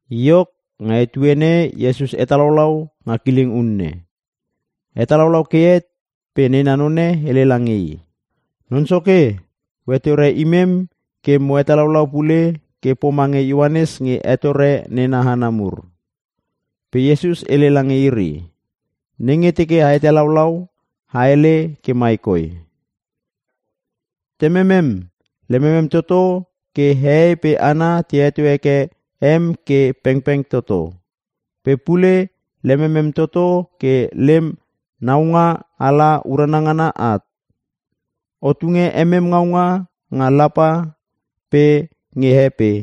Iok, nga etuene Iesus hetalaulau nga kileng unne. Hetalaulau ke het pe nena none hele lange i, “Non Soke, o hetore imem ke mo hetalaulau pule ke pomange Ioanes nge hetore nena hana mur.” Pe Iesus hele lange iri, “Nenge teke a hetalaulau, a hele ke mai koi: “‘Tememem, lememem toto ke hehei pe hana te heto heke em ke pengpeng toto. Pe pule lememem toto ke lem naunga ala urana ngana at. O tunge emem ngaunga nga lapa pe nge he pe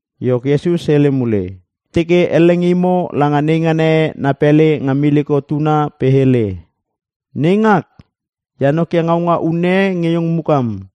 Iok, Iesus hele mule, “Teke elle nge imo langa neingana e na pele nga miliko tuna pe hele, ‘Neingak, e hanokia ngaunga unne e nge iong mukam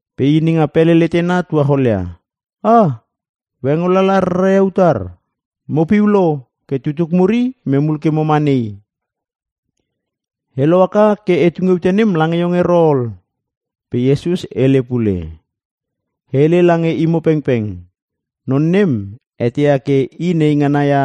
“Pe i nenga pele letena tuacholia, ‘Ah! O hengo lala rara ia utar? Mopiu lo ke tutuk mur i imem hul ke moma nei. E lohaka ke e tunge ute nem lange iong ero ol.’” Pe Iesus hele pule, “E hele lange imo pengpeng, non nem eteia ke i neingana ia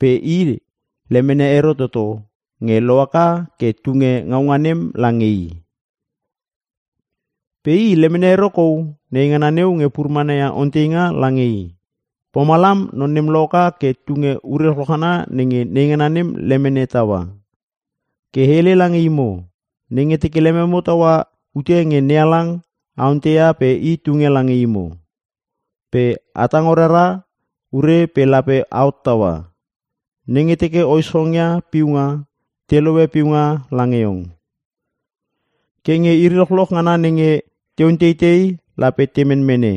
pe i lemene ero toto nge lohaka ke tunge ngaunga nem lange i. Pe i lemene ero kou neingana neu nge pur mana ia onteinga lange i. Pomalam non nem lohaka ke tunge ure lochloch ngana nenge neingana nem lemene taua. “Ke e hele lange imo; nenge teke lememo taua ute nge NeHalang a ontei pe i tunge lange imo. Pe a tango rara ure pe lape a hottaua. Nenge teke o ischongia piunga te lohe piunga lange iong. Ke nge iri lochloch ngana nenge te onteitei lape te menmene.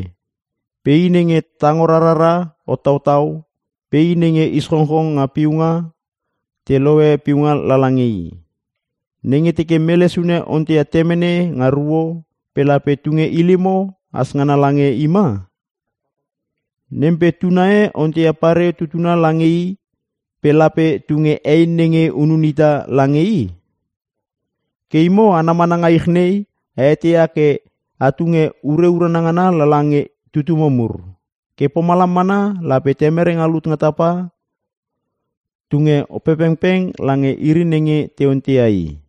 Pe i nenge tango rarara hottautau pe i nenge ischongchong nga piunga te lohe piunga lala nge i. “Nenge teke mele sune onteia temene nga ruo pe lape tunge ilimo has ngana lange i ma? Nem pe tuna e onteia pareo tutuna lange i pe lape tunge ei nenge hunun ita lange i? Ke imo hana mana nga ich nei a eteia ke a tunge ure urana ngana lala nge tutumo mur. Ke pomalam mana lape Temere nga lut nga tapa tunge Opepengpeng lange iri nenge te onteia i!”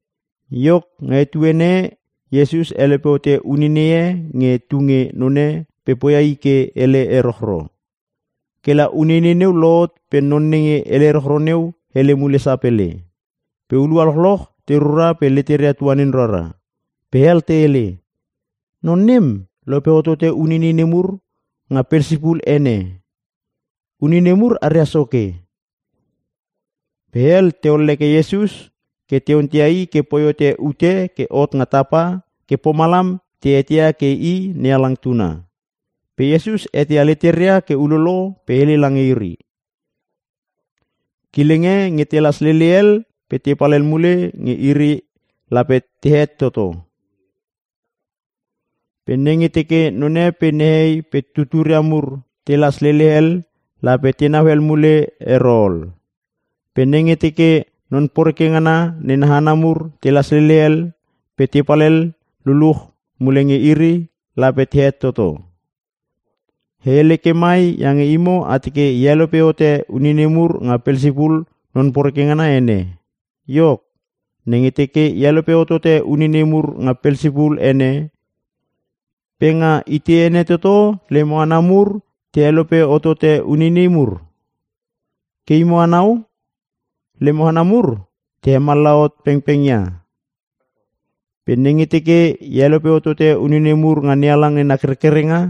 Iok, nga etuene e Iesus helope hote uneinei e nge tu nge none pe poia i ke hele erochro. Kela uneinei neu lohot pe non nenge hele erochro neu hele mule sapele. Pe hulua lochloch te rura pe leteria tuanin rara. Pe hel te hele, “Non nem lope hotote uneinei nemur nga Pelsipul ene. Uneinei mur aria soke.” Pe hel te olleke Iesus ke te onteia i ke poi hote ute ke hot nga tapa ke pomalam te eteia i ke i NeHalang tuna. Pe Iesus eteia leteria ke ulolo pe hele lange iri, “Kileng e nenge telas lele hel pe tepal hel mule nge iri lape tehet toto. Pe nenge teke none pe nehei pe tuturia mur telas lele hel lape tenau hel mule ero ol. Pe nenge teke Non Poreke ngana nena hana mur telas lele hel pe tepal hel luluch mule nge iri lape tehet toto. E hele ke mai iange imo a teke e helope hote uneinei mur nga Pelsipul Non Poreke ngana ene. Iok, nenge teke e helope hotote uneinei mur nga Pelsipul ene pe nga itei ene toto lemo hana mur te helope hotote uneinei mur? Ke imo anau, lemo hana mur te hemallaha hot pengpeng ia. Pe nenge teke e helope hotote uneinei mur nga NeHalang nena kerkerenga,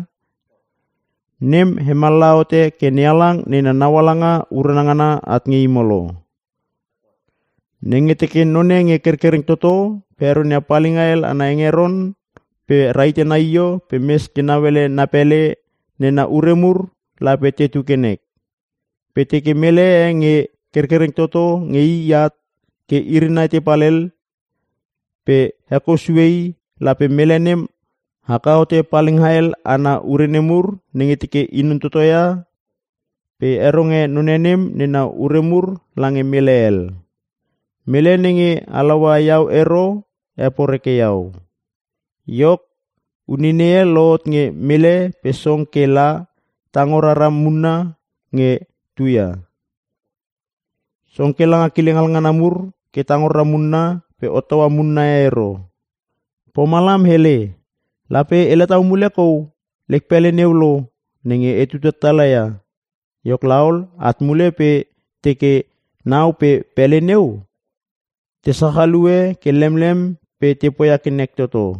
nem hemallaha hote ke NeHalang nena naualanga urana ngana at nge imo lo. “Nenge teke none nge kerkereng toto pe heronia palinga hel ana hengeron pe ra hite na io pe mes ke nauele na pele nena ure mur lape tetu ke nek. Pe teke mele e nge kerkereng toto nge i at ke iri nai tepal hel pe hekou sue i lape mele nem haka hote palinga hel ana ure nemur nenge teke i non totoia pe heronge none nem nena ure mur lange mele hel. “Mele nenge halaua iau ero heporeke iau. “Iok, uneinei e lohot nge mele pe song ke la tango rara munna nge tuia. Song ke langa kileng hal ngana mur ke tango rara munna pe hottaua munna e ero. Pomalam hele, ‘Lape ela tau mule kou lek pele neu lo nenge etu tatala ia.’ Iok laol, at mule pe teke nau pe pele neu te sachalue ke lemlem pe te poia ke nek toto.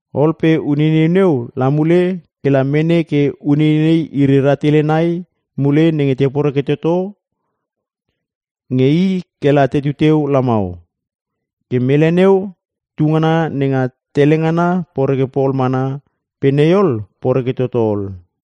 Ol pe uneinei neu la mule ke la mene ke uneinei iri rahtele nai mule nenge te poreke toto nge i ke la tetu teu lamau. Ke mele neu tungana nenga tele ngana poreke pol mana pe nei ol poreke toto ol.”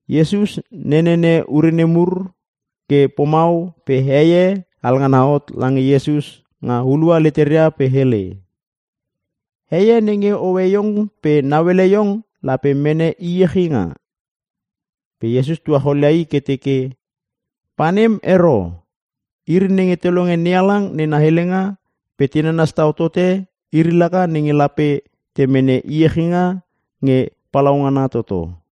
Iesus nenene ure nemur ke pomau pe hei e alngana hot lange Iesus nga hulua leteria pe hele, “Hei e nenge hoe iong pe nauele iong lape mene iechinga.” Pe Iesus tuacholia i ke teke, “Pa nem ero, iri nenge te longe NeHalang nena helenga pe te nanas tau tote iri laka nenge lape te mene iechinga nge palaungana toto.”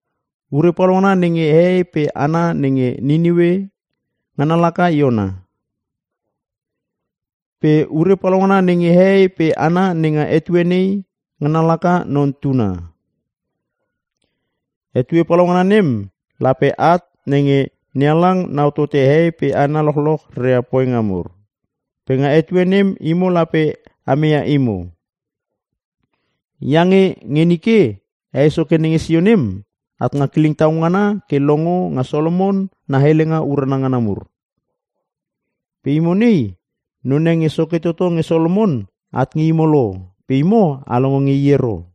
Ure palaungana nenge hehei pe hana nenge Niniue, ngana laka Iona. Pe ure palaungana nenge hehei pe hana nenga etue nei, ngana laka Non Tuna. “Etue palaungana nem lape at nenge NeHalang nau tote hehei pe hana lochloch reria poinga mur. Pe nga etue nem imo lape a meia imo. Iange nge nike hei soke nenge sio nem at nga kileng tau ngana ke longo nga Solomon na helenga urana ngana mur. Pe imo nei, none nge soke toto nge Solomon at nge imo lo pe imo a longo nge i ero.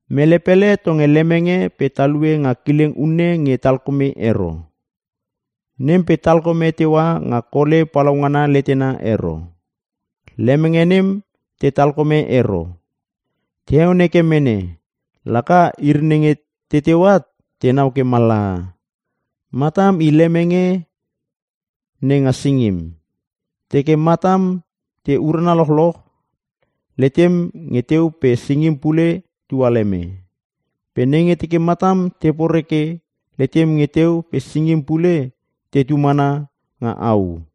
“Mele pele tonge lemenge pe talue nga kileng unne nge talkome ero. Nem pe talkome teua nga kole palaungana letena ero. Lemenge nem te talkome ero. Te heon heke mene. Laka iri nenge te teu at te nau ke mallaha. Matam i lemenge nenga singim. Teke matam te urana lochloch letem nge teu pe singim pule tualeme. Pe nenge teke matam te poreke letem nge teu pe singim pule tetu mana nga au.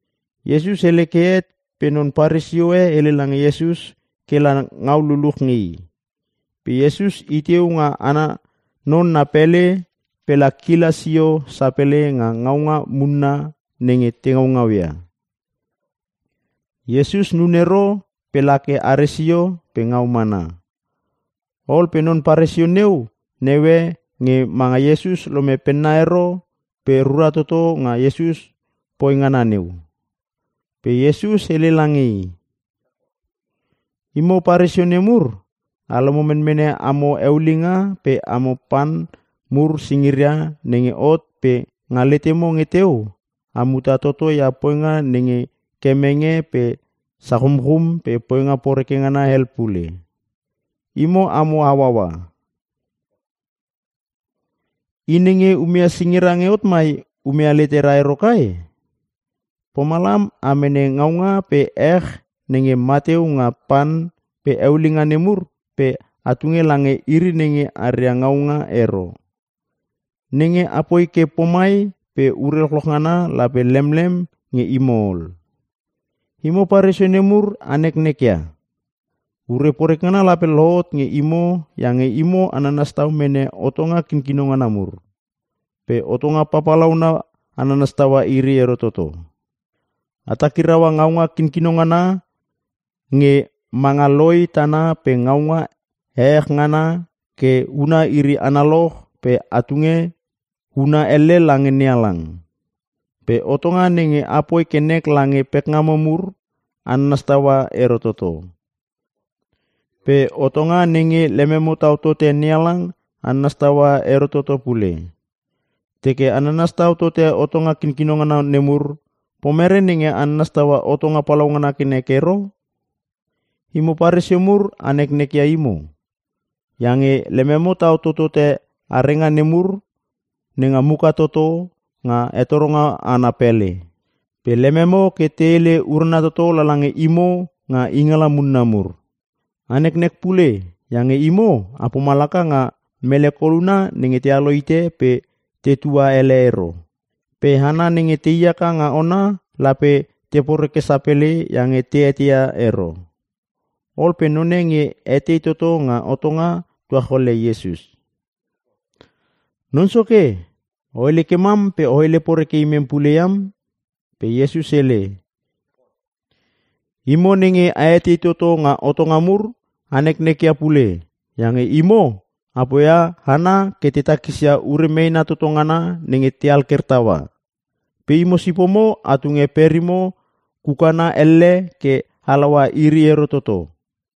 Iesus hele ke het pe non Paresio e hele lange Iesus ke la ngau luluch nge i. Iesus iteu nga ana non na pele pela kila sio sapele nga ngaunga munna nenge te ngaungau ia. Iesus nun ero pe la ke are sio pe ngau mana. Ol pe non Paresio neu neue nge manga Iesus lome penna ero pe rura toto nga Iesus poi ngana neu. Pe Iesus hele lange i, “Imo Paresio nemur, a lomo menmene amo eulinga pe amo pan mur singiria nenge hot pe nga letemo nge teu a muta toto ia poinga nenge kemenge pe sachumchum pe poinga poreke ngana hel pule. Imo amo hauaua! I nenge umeia singira nge hot mai umeia leteria ero kai? Pomalam a mene ngaunga pe ech nenge mateu nga pan pe eulinga nemur pe a tunge lange iri nenge aria ngaunga ero. Nenge apoi ke pomai pe ure lochloch ngana lape lemlem nge imo ol. “Imo Paresio nemur a neknek ia! Ure poreke ngana lape lohot nge imo iange imo a nanas tau mene hotonga kinkino ngana mur. Pe hotonga papalauna a nanas taua iri ero toto. A takiraua ngaunga kinkino ngana nge manga loi tana pe ngaunga ehech ngana ke huna iri analoch pe a tunge huna elle lange NeHalang. Pe hotonga nenge apoi ke nek lange pekngamo mur, a nanas taua ero toto. Pe hotonga nenge lememo tau tote NeHalang a nanas taua ero toto pule. Teke a nanas tau tote hotonga kinkino ngana nemur pomere nenge a nanas taua hotonga papalauna ke nek ero? “Imo Paresio mur a neknek ia imo! Iange lememo tau totote arenga nemur nga muka toto nga hetoronga ana pele. Pe lememo ke te hele ke urana toto lala nge imo nga ingala munna mur. “A neknek pule iange imo a pomalaka nga mele koluna nge tealo hite pe tetua ele ero. Pe hana nenge tei haka nga ona lape te poreke sapele iange te eteia ero.” Ol pe none nge etei toto nga hotonga tuacholia Iesus, “Non Soke, o hele ke mam pe o hele poreke imem pule iam.” Pe Iesus hele, “Imo nenge a etei toto nga hotonga mur a neknek ia pule iange imo a poia hana ke te takisia ure meena toto ngana nenge te alker taua. Pe imo sipomo a tunge perimo kukana elle ke a halaua iri ero toto.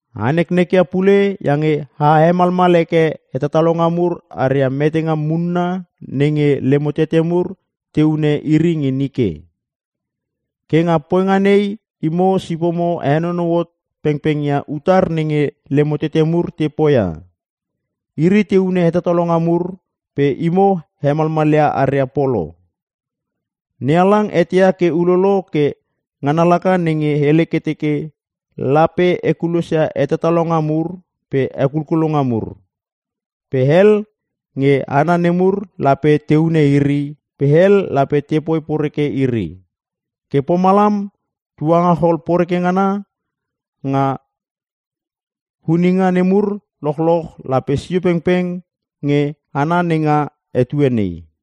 “A neknek ia pule iange a hemalmal heke hetatalonga mur aria metenga munna nenge lemo tete mur te hune iri nge nike. Ke nga poinga nei imo sipomo a henonou hot pengpeng ia utar nenge lemo tete mur te poia. Iri te hune hetatalonga mur pe imo a hemalmalia aria polo. NeHalang eteia ke ulolo ke ngana laka nenge hele ke teke, ‘Lape e kulosia hetatalonga mur pe hekulkulonga mur. Pe hel nge hana nemur lape te hune iri pe hel lape tepoi poreke iri.’ Ke pomalam tuangachol poreke ngana nga huninga nemur lochloch lape sio pengpeng nge hana nenga etue nei.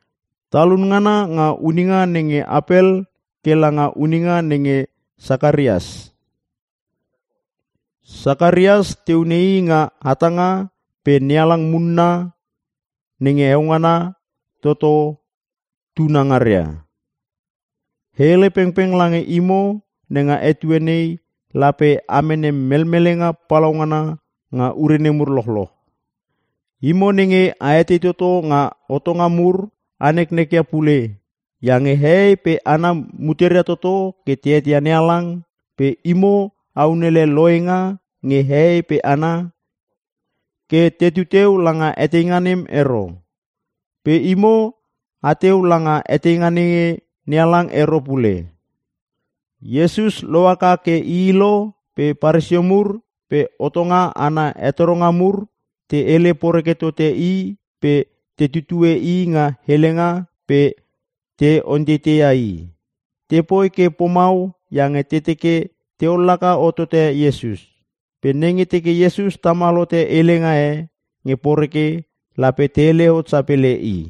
Talun ngana nga huninga nenge Apel ke langa huninga nenge Sakarias. (Sakarias te hune i nga hatanga pe NeHalang munna nenge heo ngana toto tunangaria). E hele pengpeng lange imo nenga etue nei lape a mene melmelenga palaungana nga ure nemur lochloch. “Imo nenge a etei toto nga hotonga mur a neknek ia pule iange hehei pe hana muteria toto ke te eteia NeHalang pe imo a unele lohenga nge hehei pe hana ke teteu langa eteinga nem ero. Pe imo ateu langa eteinga nenge NeHalang ero pule.” Iesus lohaka ke ii lo pe Paresio mur pe hotonga ana hetoronga mur te hele poreke tote i pe te tutue i nga helenga pe te onteiteia i. Tepoi ke pomau iange te teke te ollaka hotote Iesus. Pe nenge teke Iesus tamal hote helenga e nge poreke lape te hele hot sapele i.